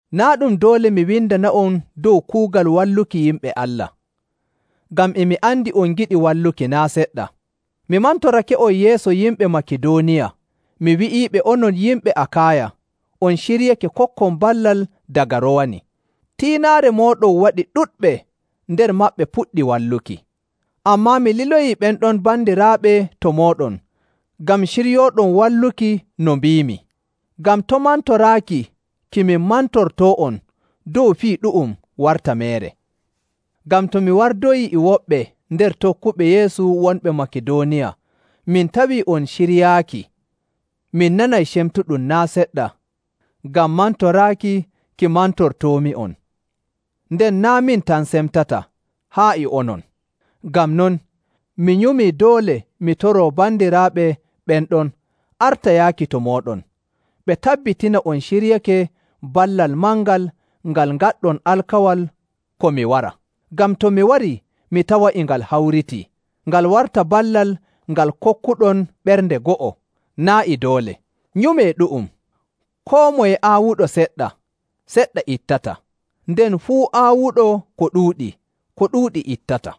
Naa' ɗum doole mi windana'on dow kuugal walluki yimɓe Allah. Ngam e mi andi on ngiɗi walluki naa' seɗɗa. Mi mantorake'on yeeso yimɓe Makidooniya mi wi'iiɓe onon yimɓe Akaaya on ciryake kokkon ballal daga rowani. Tiinaare mooɗon waɗi ɗuɗɓe nder maɓɓe puɗɗi walluki. Ammaa mi liloyii ɓen ɗon bandiraaɓe to mooɗon ngam ciryooɗon walluki no mbiimi, ngam to' mantoraaki ki min mantortoo'on dow fii ɗu'um warta meere. Ngam to mi wardoyii e woɓɓe nder tokkuɓe Yeesu wonɓe Makidooniya min tawii on ciryaaki, mi nanay cemtuɗum naa' seɗɗa ngam mantoraaki ki mantortoomi'on, nden naa' min tan semtata, haa e onon. Ngam non, mi nyumii doole mi toroo bandiraaɓe ɓen ɗon arta yaaki to mooɗon, ɓe tabbitina on ciryake ballal mangal ngal ngaɗɗon alkawal ko mi wara. Ngam to mi warii mi tawa e ngal hawritii, ngal warta ballal ngal kokkuɗon ɓernde go'o, naa' e doole. Nyumee ɗu'um. Koo moye aawuɗo seɗɗa, seɗɗa ittata, nden fuu aawuɗo ko ɗuuɗi, ko ɗuuɗi ittata.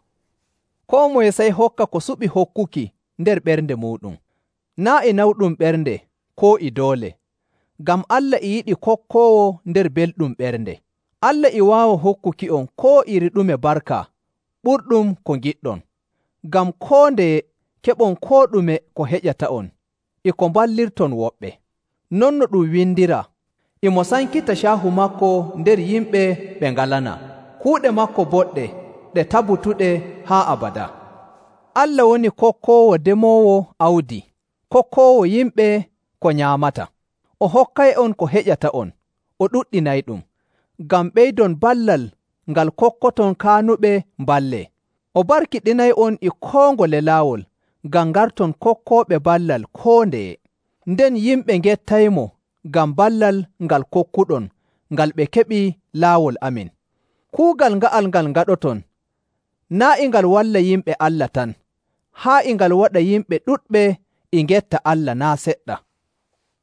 Koo moye sey hokka ko suɓi hokkuki nder ɓernde muuɗum, naa' e nawɗum ɓernde koo e doole, ngam Allah e yiɗi kokkoowo nder belɗum ɓernde. Allah e waawa hokkuki'on koo iri ɗume barka ɓurɗum ko ngiɗɗon, ngam koo ndeye keɓon koo ɗume ko heƴata'on e ko mballirton woɓɓe. Non no ɗum windiraa, “E mo sankita caahu maako nder yimɓe ɓe ngalanaa, kuuɗe maako boɗɗe ɗe tabutuɗe haa abadaa.” Allah woni kokkoowo demoowo awdi, kokkoowo yimɓe ko nyaamata. O hokkay'on ko heƴata'on, o ɗuɗɗinayɗum, ngam ɓeydon ballal ngal kokkoton kaanuɓe mballee. O barkiɗinay'on e koo ngole laawol ngam ngarton kokkooɓe ballal koo ndeye, nden yimɓe ngettaymo ngam ballal ngal kokkuɗon ngal ɓe keɓi laawol amin. Kuugal nga'al ngal ngaɗoton, naa' e ngal walla yimɓe Allah tan, haa e ngal waɗa yimɓe ɗuɗɓe e ngetta Allah naa' seɗɗa.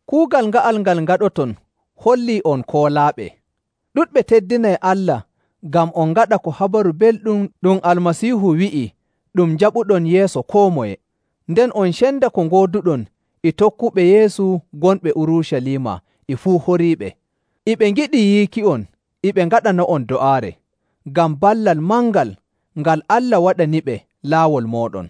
Kuugal nga'al ngal ngaɗoton hollii on koolaaɓe. Ɗuɗɓe teddinay Allah ngam on ngaɗa ko Habaru Belɗum ɗum Almasiihu wi'i ɗum njaɓuɗon yeeso koo moye, nden on cenda ko ngooduɗon e tokkuɓe Yeesu gonɓe Urucaliima e fuu horiiɓe. E ɓe ngiɗi yiiki'on e ɓe ngaɗana'on do'aare, ngam ballal mangal ngal Allah waɗaniɓe laawol mooɗon.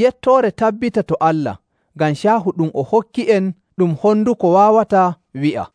Yettoore tabbita to Allah ngam caahu ɗum o hokki'en ɗum honduko waawataa wi'a.